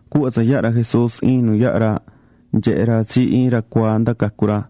Cuhva tsa yaha̱ ra Jesús iin nu yaha̱ ra, nyehe̱ ra tsi iin ra cuaa nda cacu̱ ra.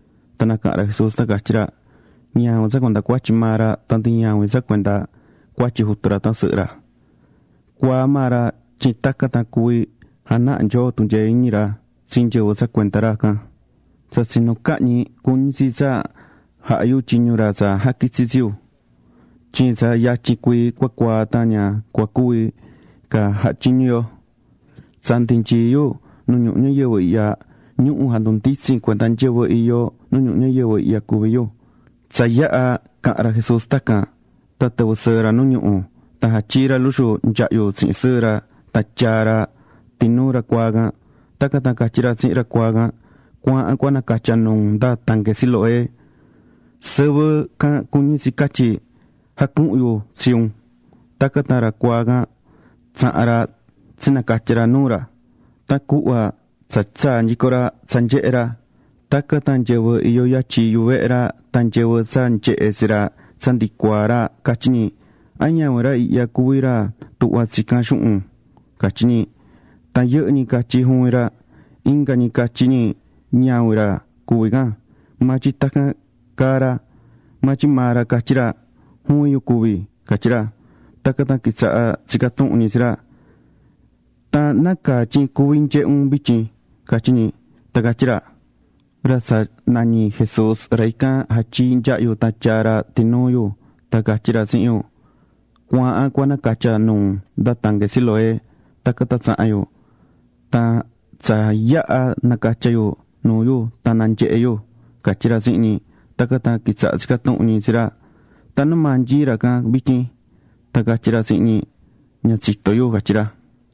Tan nacaha̱n ra Jesús tan catyí ra: ―Ñavin tsa cuenda cuatyi maa ra, tan ndi ñavin tsa cuenda cuatyi jutu ra tan sɨhɨ ra. Cuaa maa ra tyin tacan tan cuví janaha Nyoo tunyee iñi ra tsi nyɨvɨ tsa cuenda ra can. Tsa tsinu cahñi, cuñí tsi tsa javaha yu tyiñu ra tsa jaquitsi̱ tsi yu. Tyin tsa yatyin cuii cua cuaa tan ña cua cuvi ca jaha tyiñu yo. Tsa ndi nyií yu nu ñuhu ñayɨvɨ ihya, ñuhu̱ jandunditsín [cuenda nyɨvɨ iyó] nu ñuhu ñayɨvɨ ihya cuví yu. Tsa yaha̱ tsa caha̱n ra Jesús tacan, tan tɨvɨ̱ sɨɨ ra nu ñuhu̱. Tan jatyii̱ ra luxu nyahyu tsihin sɨɨ ra tan tyaa̱ ra tinuu ra cuaa can. Tacan tan catyí ra tsihin ra cuaa can: ―Cu̱aahan cua nacatya nuu un nda tanque Siloé. ―Sɨvɨ can cuñí tsi catyí: “Jacuhu̱n Yu Tsi Un.” Tacan tan ra cuaa can tsaha̱n ra tsinacatya̱ ra nuu ra. Tan cuhva tsa tsaa̱ nyico ra, tsa nyehé ra. Tacan tan nyɨvɨ iyó yatyin yuvehe ra, tan nyɨvɨ tsa nyehe̱ tsi ra tsa ndi cuaá ra catyí ñi: ―¿A ñavin ra ihya cuví ra tuhvá tsinyaá tsicán xuhun? ―catyí ñi. Tan yɨhɨ́ ñi catyí: ―Juvin ra. Inga ñi catyí ñi: ―Ñavin ra cuví can, maa tyin tacan caá ra. Maa tyin maa ra catyí ra: ―Juvin yu cuví ―catyí ra. Tacan tan quitsaha̱ tsicá tuhun ñi tsi ra: ―¿Tan nácaa tyin cuví nyehé un vityin? ―catyí ñi. Tan catyí ra: ―Ra tsa nañí Jesús, ra ican jatyii̱ nyahyu tan tyaa̱ ra tinuu yu tan catyí ra tsihin yu: “Cu̱aahan cua nacatya nuu un nda tanque Siloé.” Tacan tan tsaha̱n yu. Tan tsa yaha̱ nacatya̱ yu nuu yu tan nanyehe̱ yu ―catyí ra tsihin ñi. Tacan tan quitsaha̱ tsicá tuhun ñi tsi ra: ―¿Tan numaa nyií ra can vityin? Tan catyí ra tsihin ñi: ―Ña tsitó yu ―catyí ra.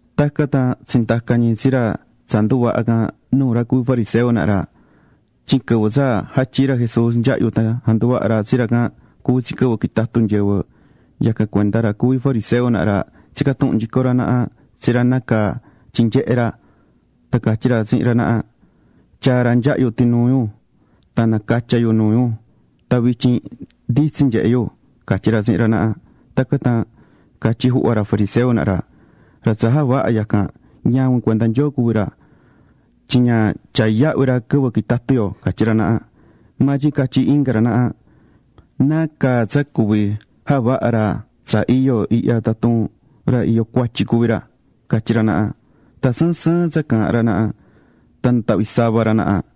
Tacan tan tsindaca̱ ñi tsi ra tsa nduvaha̱ can nuu ra cuví fariseo naha ra. Tyin quɨvɨ tsa jatyii̱ ra Jesús nyahyu tan janduvaha̱ ra tsi ra can, cuví tsi quɨvɨ quitatú nyɨvɨ. Yacan cuenda ra cuví fariseo naha ra tsica̱ tuhun nyico ra naha tsi ra nácaa tyin nyehé ra. Tan catyí ra tsihin ra naha: ―Tyaa̱ ra nyahyu tinuu yu, tan nacatya̱ nuu yu tan vityin nditsin nyehé yu ―catyí ra tsihin ra naha. Tacan tan catyí juhva ra fariseo naha ra: ―Ra tsa javaha̱ yacan ñavin cuenda Nyoo cuví ra, tyin ña tyaá yahvi ra quɨvɨ quitatú yo ―catyí ra naha. Maa tyin catyí inga ra naha ―¿Nacaa tsa cuví javaha̱ ra tsa iyo ihya tatun ra iyó cuatyi cuví ra? ―catyí ra naha. Tan sɨɨn sɨɨn tsa caahán ra naha. Tan natahvi̱ sava ra naha.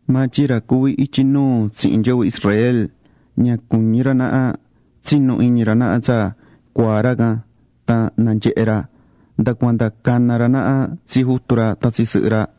Maa tyin ra cuví ityi nuu tsihin nyɨvɨ Israel ña cuñí ra naha tsinu iñi ra naha tsa cuaa̱ ra can tan nanyehe̱ ra. Nda cuanda cana̱ ra naha tsi jutu ra tan tsi sɨhɨ ra.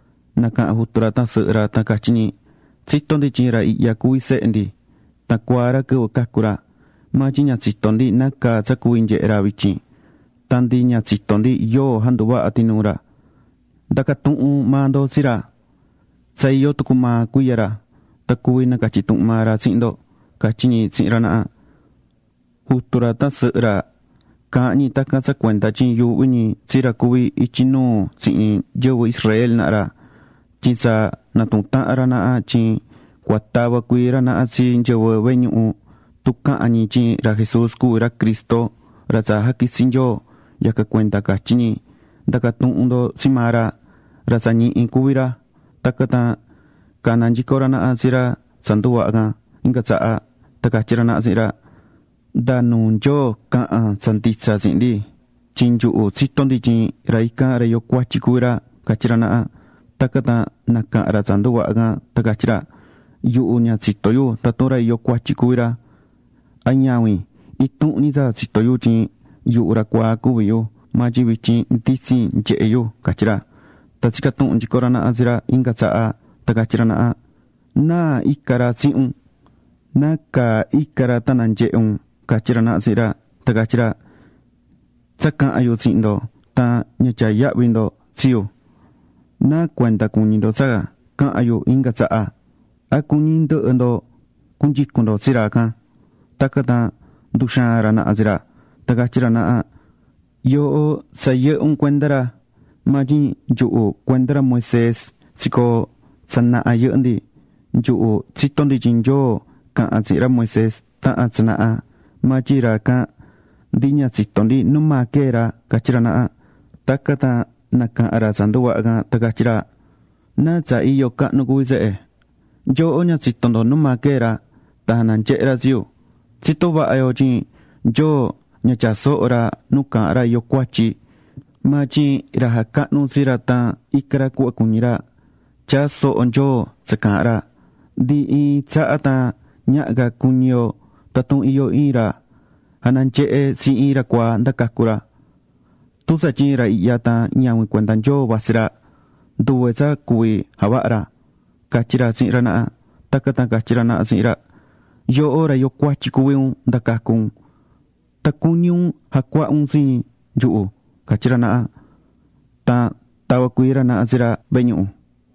Nacaha̱n jutu ra tan sɨhɨ ra tan catyí ñi: ―Tsitó ndi tyin ra ihya cuví sehe ndi. Tan cuaa ra quɨvɨ cacu̱ ra. Maa tyin ña tsitó ndi nácaa tsa cuví nyehé ra vityin. Tan ndi ña tsitó ndi yóo janduvaha̱ tinuu ra. Nda̱ca tuhun maa ndo tsi ra. Tsa iyó tucu maa cuiya ra. Tan cuví nacatyi tuhun maa ra tsihin ndo ―catyí ñi tsihin ra naha. Jutu ra tan sɨhɨ ra caahán ñi tacan tsa cuenda tyin yuuhví ñi tsi ra cuví ityi nuu tsihin nyɨvɨ Israel naha ra, tyin tsa natuhu̱n tahan ra naha tyin cua tava cuii ra naha tsi nyɨvɨ vehe ñuhu, tun cahan ñi tyin ra Jesús cuví ra Cristo, ra tsa jaquitsi̱ Nyoo. Yacan cuenda catyi̱ ñi: “Nda̱ca tuhun ndo tsi maa ra. Ra tsa ñihi cuví ra.” Tacan tan cana̱ nyico ra naha tsi ra tsa nduvaha̱ can inga tsaha. Tan catyí ra naha tsihin ra: ―Nda nuu Nyoo ca̱han tsa nditsa tsihin ndi. Tyin nyuhu tsitó ndi tyin ra ican, ra iyó cuatyi cuví ra ―catyí ra naha. Tacan tan nacaha̱n ra tsa nduvaha̱ can tan catyí ra: ―Yuhu ña tsitó yu tatun ra iyó cuatyi cuví ra, a ñavin. Intuhun ñi tsa tsitó yu tyin yuhu ra cuaa cuví yu, maa tyin vityin nditsin nyehé yu ―catyí ra. Tan tsica̱ tuhun nyico ra naha tsi ra inga tsaha tan catyí ra naha: ―¿Náa ica̱ ra tsihin un? ¿Nacaa ica̱ ra tan nanyehe̱ un? ―catyí ra naha tsihin ra. Tan catyí ra: ―Tsa caha̱n yu tsihin ndo, tan ña tyaá yahvi ndo tsi yu. ¿Náa cuenda cuñí ndo tsa cahan yu inga tsaha? ¿A cuñí ndɨhɨ ndo cunyicun ndo tsi ra can? Tacan tan nduxaa̱n ra naha tsi ra, tan catyí ra naha: ―Yooho tsa yɨhɨ́ un cuenda ra, maa tyin nyuhu cuenda ra Moisés ra tsa tsicoo̱ tsa naha yɨhɨ́ ndi. Nyuhu tsitó ndi tyin Nyoo caha̱n tsihin ra Moisés taha̱n tsa naha. Maa tyin ra can, ndi ña tsitó ndi numaa quee̱ ra ―catyí ra naha. Tacan tan nacaha̱n ra tsa nduvaha̱ can tan catyí ra: ―¡Naa tsa iyo cahnu cuví tsehe! Nyooho ña tsitó ndo numaa quee̱ ra, tan jananyehe̱ ra tsi yu. Tsitó vaha yo tyin Nyoo ña tyaá soho ra nu caahán ra iyó cuatyi. Maa tyin ra jacahnú tsi ra tan icá ra cuhva cuñí ra, tyaá soho Nyoo tsa caahán ra. Ndi iin tsaha tan ñaha ca cuñi yo tatun iyó iin ra jananyehe̱ tsi iin ra cuaá nda cacu̱ ra. Tun tsatyin ra ihya tan ñavin cuenda Nyoo vatsí ra, nduve tsa cuví javaha ra ―catyí ra tsihin ra naha. Tacan tan catyí ra naha tsihin ra: ―Yooho ra iyó cuatyi cuví un nda cacu̱ un. ¿Tan cuñí un jacuaha un tsi nyuhu? ―catyí ra naha. Tan tava̱ cuii ra naha tsi ra vehe ñuhu.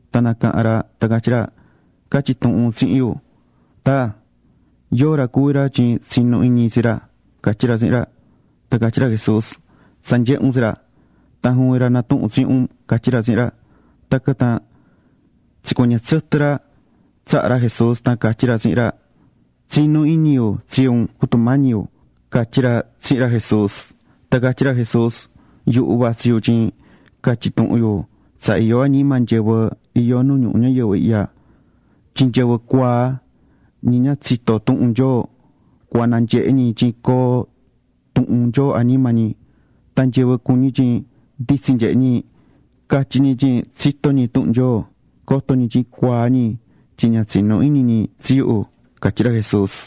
Tan nacaha̱n ra tan catyí ra: ―Ca̱tyi tuhun tsihin yu, taa, yóo ra cuví ra tyin tsinú iñi yu tsi ra ―catyí ra tsihin ra. Tan catyí ra Jesús: ―Tsa nyehe̱ un tsi ra. Tan juvin ra natuhún tsihin un ―catyí ra tsihin ra. Tacan tan tsicuɨñɨ̱ tsɨtɨ ra tsaha ra Jesús tan catyí ra tsihin ra: ―Tsinú iñi yu tsi un, Jutu Mañi yu ―catyí ra tsihin ra Jesús. Tan catyí ra Jesús: ―Yuhu vatsí yu tyin catyi tuhun yu tsa iyó añima nyɨvɨ iyó nu ñuhu ñayɨvɨ ihya. Tyin nyɨvɨ cuaa, ñi ña tsitó tuhun Nyoo cua nanyehe ñi tyin coo tuhun Nyoo añima ñi. Tan nyɨvɨ cuñí tyin nditsin nyehe ñi, catyí ñi tyin tsitó ñi tuhun Nyoo, coto ñi tyin cuaa ñi tyin ña tsinú iñi ñi tsi yu ―catyí ra Jesús.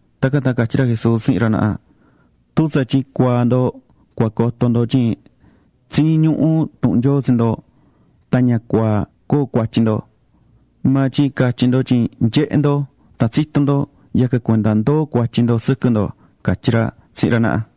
Tacan tan catyí ra Jesús tsihin ra naha: ―Tun tsatyin cuaa ndo cua coto ndo tyin tsiñí ñuhu tuhun Nyoo tsi ndo, tan ña cua coo cuatyi ndo. Maa tyin catyí ndo tyin nyehé ndo tan tsitó ndo, yacan cuenda ndoó cuatyi ndo sɨquɨ ndo ―catyí ra tsihin ra naha.